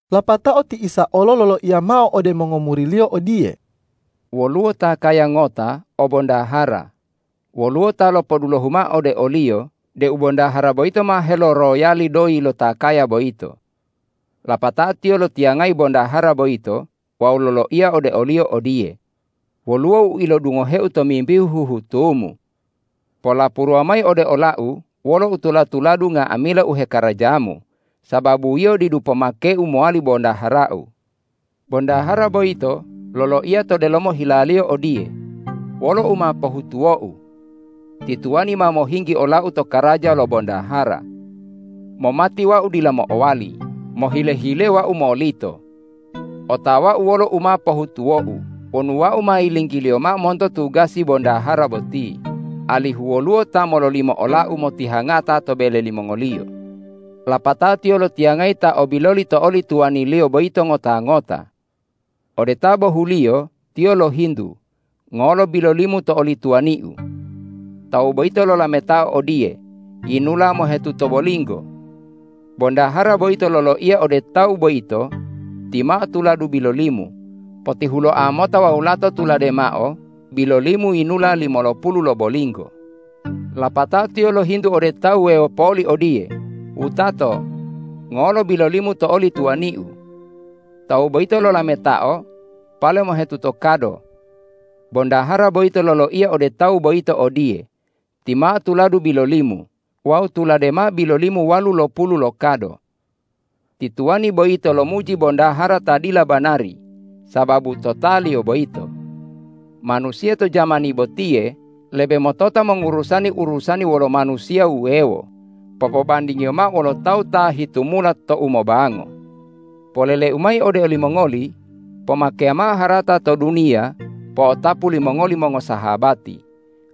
Lapatao ti Isa olo loloiya mao ode mongomuri-Liyo odiye,”Woluwo ta kaya ngota o bondahara. Woluwo ta lopodulohu mao ode oliyo deu bondahara boyito ma heloroyali doyi lo ta kaya boyito. Lapatao tiyo lotiyangayi bondahara boyito wawu loloiya ode oliyo odiye, ’Woluwo u ilodungoheu tomimbihu huhutumu. Polapuruwa mayi ode olau wolo utula-tuladu, nga'amila u hekarajamu, sababu yio didu pomakeu mowali bondaharau.’ Bondahara boyito loloiya to delomo hilaliyo odiye, ’Wolo u ma pohutuwou? Ti tuwani ma mohinggi olau to karaja lo bondahara. Momati wau dila mo'owali, mohile-hile wau molito. Otawau wolo u ma pohutuwou wonu wau ma yilinggiliyo mao monto tugasi bondahara boti, alihu woluwo ta mololimo olau motihangata to bele limongoliyo.’ Lapatao tiyo lotiyangayi ta o biloli to oli tuwaniliyo boyito ngota-ngota. Ode ta bohuliyo tiyo lohintu, ’Ngolo bilolimu to oli tuwaniu?’ Tawu boyito lolametao odiye, ’Yinula mohetuto bolinggo.’ Bondahara boyito loloiya ode tawu boyito, ’Timao tuladu bilolimu, potihuloa mota wawu lato tulade mao, bilolimu yinula limolopulu lo bolinggo.’ Lapatao tiyo lohintu ode ta wuwewo poli odiye, ’Wutato, ngolo bilolimu to oli tuwaniu?’ Tawu boyito lolametao, ’Pale mohetuto kado.’ Bondahara boyito loloiya ode tawu boyito odiye, ’Timao tuladu bilolimu wawu tulade mao bilolimu walulopulu lo kado.’ Ti tuwani boyito lomuji bondahara ta dila banari sababu totaliyo boyito. Manusiya to jamani botiye lebe motota mongurusani urusani wolo manusiya wuwewo popobandingiyo mao wolo tawu ta hitumula to umobango. Polele-U mayi ode olimongoli: Pomakeya mao harata to duniya po'otapu limongoli mongosahabati,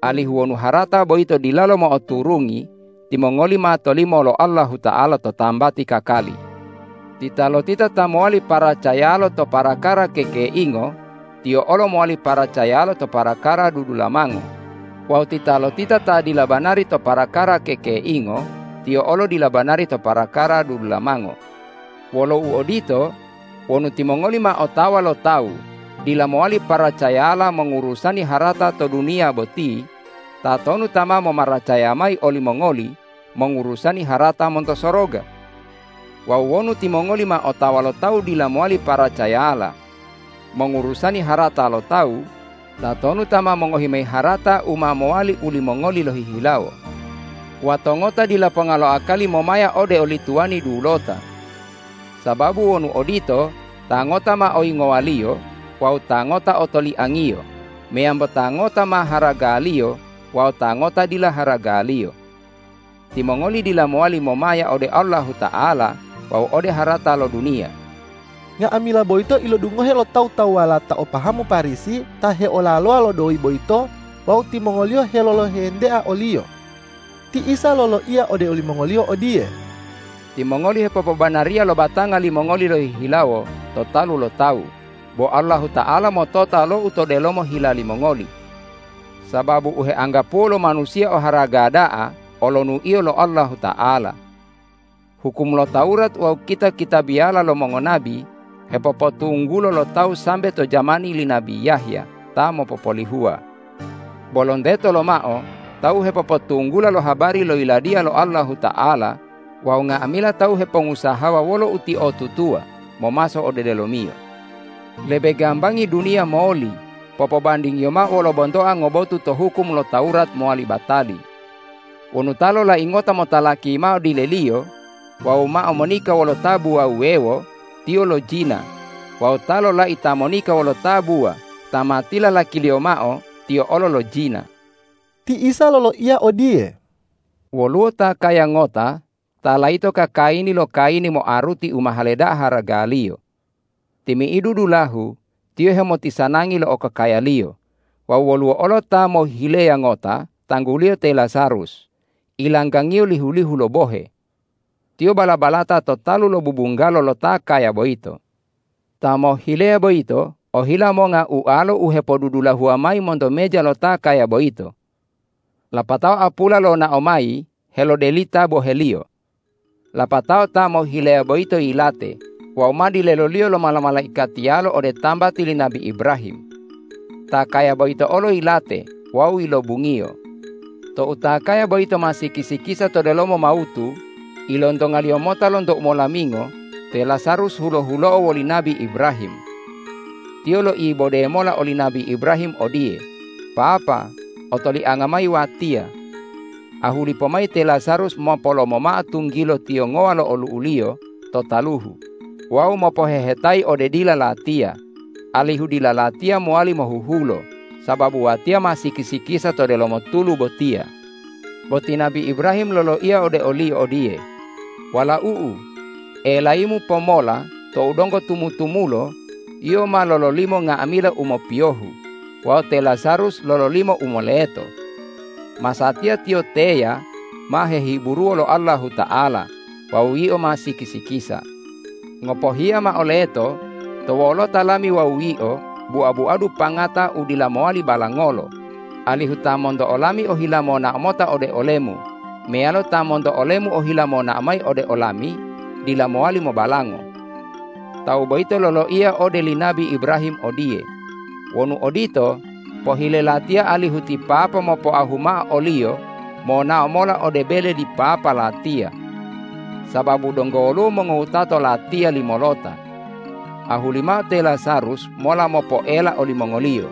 alihu wonu harata boyito dilalo mo'oturungi, timongoli ma tolimo lo Allahuta'ala to tambati kakali. Titalotita ta mowali paracayalo to parakara kekeingo, tiyo olo mowali paracayalo to parakara dudulamango; wawu titalotita ta dila banari to parakara kekeingo, tiyo olo dila banari to parakara dudulamango. Wolo uodito, wonu timongoli ma otawa lo tawu dila mowali paracayala mongurusani harata to duniya boti, tatonu ta ma momaracaya mayi olimongoli mongurusani harata monto soroga? Wawu wonu timongoli ma otawa lo tawu dila mowali paracayala mongurusani harata lo tawu, tatonu ta ma mongohi mayi harata u ma mowali u limongoli lohihilawo? Wato ngota dila ponga lo akali momaya ode oli tuwani dulota. Sababu wonu odito, ta ngota ma oyingowaliyo wawu ta ngota otoliangiyo meyambo ta ngota ma haragaliyo wawu ta ngota dila haragaliyo. Timongoli dila mowali momaya ode Allahuta'ala wawu ode harata lo duniya.” Nga'amila boyito ilodungohe lo tawu-tawuwala ta o pahamu Parisi ta heolalowa lo doyi boyito wawu timongoliyo helolohentea o-Liyo. Ti Isa loloiya ode olimongoliyo odiye,”Timongoli hepopobanariya lo batanga limongoli lohihilawo to talu lo tawu, bo Allahuta'ala motota lo u to delomo hila limongoli. Sababu u heanggapuwo lo manusiya oharaga da'a olonuiyo lo Allahuta'ala. Hukum lo Tawurat wawu kita-kitabiyala lo mongonabi hepopotunggulo lo tawu sambe to jamani li nabi Yahya ta mopopolihuwa. Bo lonteto lomao tawu hepopotunggula lo habari lo Yiladiya lo Allahuta'ala wawu nga'amila tawu hepongusahawa wolo utiotutuwa momaso ode delomiyo. Lebe gambangi duniya moli popobandingiyo mao wolo bontoa ngobotu to hukum lo Tawurat mowali batali. Wonu ta lolai ngota motalaki mao dileliyo wawu mao monika wolo tabuwa wuwewo, tiyo lojina; wawu ta lolai ta monika wolo tabuwa ta ma tilalakiliyo mao, tiyo olo lojina.” Ti Isa loloiya odiye,”Woluwo ta kaya ngota ta layito kakayini lo kayini moaruti u mahale da'a haragaliyo. Timi'idu dulahu tiyo hemotisanangi lo okokayaliyo. Wawu woluwo olo ta mohhileya ngota tangguliyo te Lazarus, ilanggangiyo lihu-lihu lo bohe. Tiyo bala-balata to talu lo bubunggalo lo ta kaya boyito. Ta mohhileya boyito ohila monga ualo hepodudulahuwa mayi monto meja lo ta kaya boyito. Lapatao apula lonao mayi helodelita boheliyo. Lapatao ta mohhileya boyito yilate wawu ma dileloliyo lo mala-malaikatiyalo ole tambati li nabi Ibrahim. Ta kaya boyito olo yilate wawu yilobungiyo. Tou ta kaya boyito ma siki-sikisa to delomo mawutu, ilontongaliyo mota lonto umolamingo te Lazarus hulo-hulo'o woli nabi Ibrahim. Tiyo loibode mola oli nabi Ibrahim odiye, ’Papa, otolianga mayi watiya! Ahuli pomayi te Lazarus mopolomo mao tunggilo tiyongowa lo olu'uliyo to taluhu wawu mopohehetayi ode dila latiya alihu dila latiya mowali mohuhulo, sababu watiya ma siki-sikisa to delomo tulu botiya!’ Bo ti nabi Ibrahim loloiya ode oliyo odiye, ’Walau'u, elayimu pomola tou donggo tumu-tumulo, yio ma lololimo nga'amila u mopiyohu wawu te Lazarus lololimo u moleto. Masatiya tiyo teya ma hehiburuwo lo Allahuta'ala wawu yio ma siki-sikisa. Ngopohiya mao leto to wolota lami wawu yio bua-buadu pangata u dila mowali balangolo, alihu ta monto olami ohila monao mota ode olemu meyalo ta monto olemu ohila monao mayi ode olami dila mowali mobalango!’ Tawu boyito loloiya ode li nabi Ibrahim odiye, ’Wonu odito, pohile latiya alihu ti papa mopoahu mao oliyo monao mola ode bele li papa latiya. Sababu donggo woluwo mongowutato latiya limolota. Ahuli mao te Lazarus mola mopoela olimongoliyo,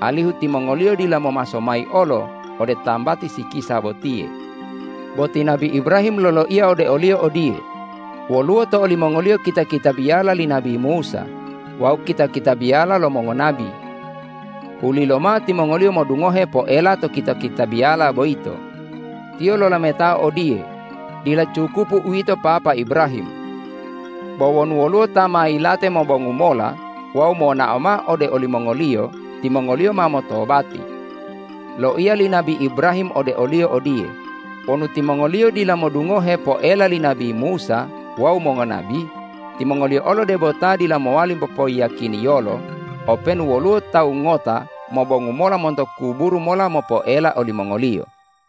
alihu timongoliyo dila momaso mayi olo ode tambati sikisa botiye.’ Bo ti nabi Ibrahim loloiya ode oliyo odiye, ’Woluwo to olimongoliyo kita-kitabiyala li nabi Musa wawu kita-kitabiyala lo mongonabi! Hulilomao timongoliyo modungohe poela lo kita-kitabiyala boyito.’ Tiyo lolametao odiye, ’Dila cukupu uwito papa Ibrahim! Bo wonu woluwo ta ma yilate mobongu mola wawu monao mao ode olimongoliyo, timongoliyo ma motobati.’ Loiya li nabi Ibrahim ode oliyo odiye, ’Wonu timongoliyo dila modungohe poela li nabi Musa wawu mongonabi, timongoliyo olo debo ta dila mowali popoyiyakiniyolo openu woluwo tawu ngota mobongu mola monto kuburu mola mopoela olimongoliyo.’”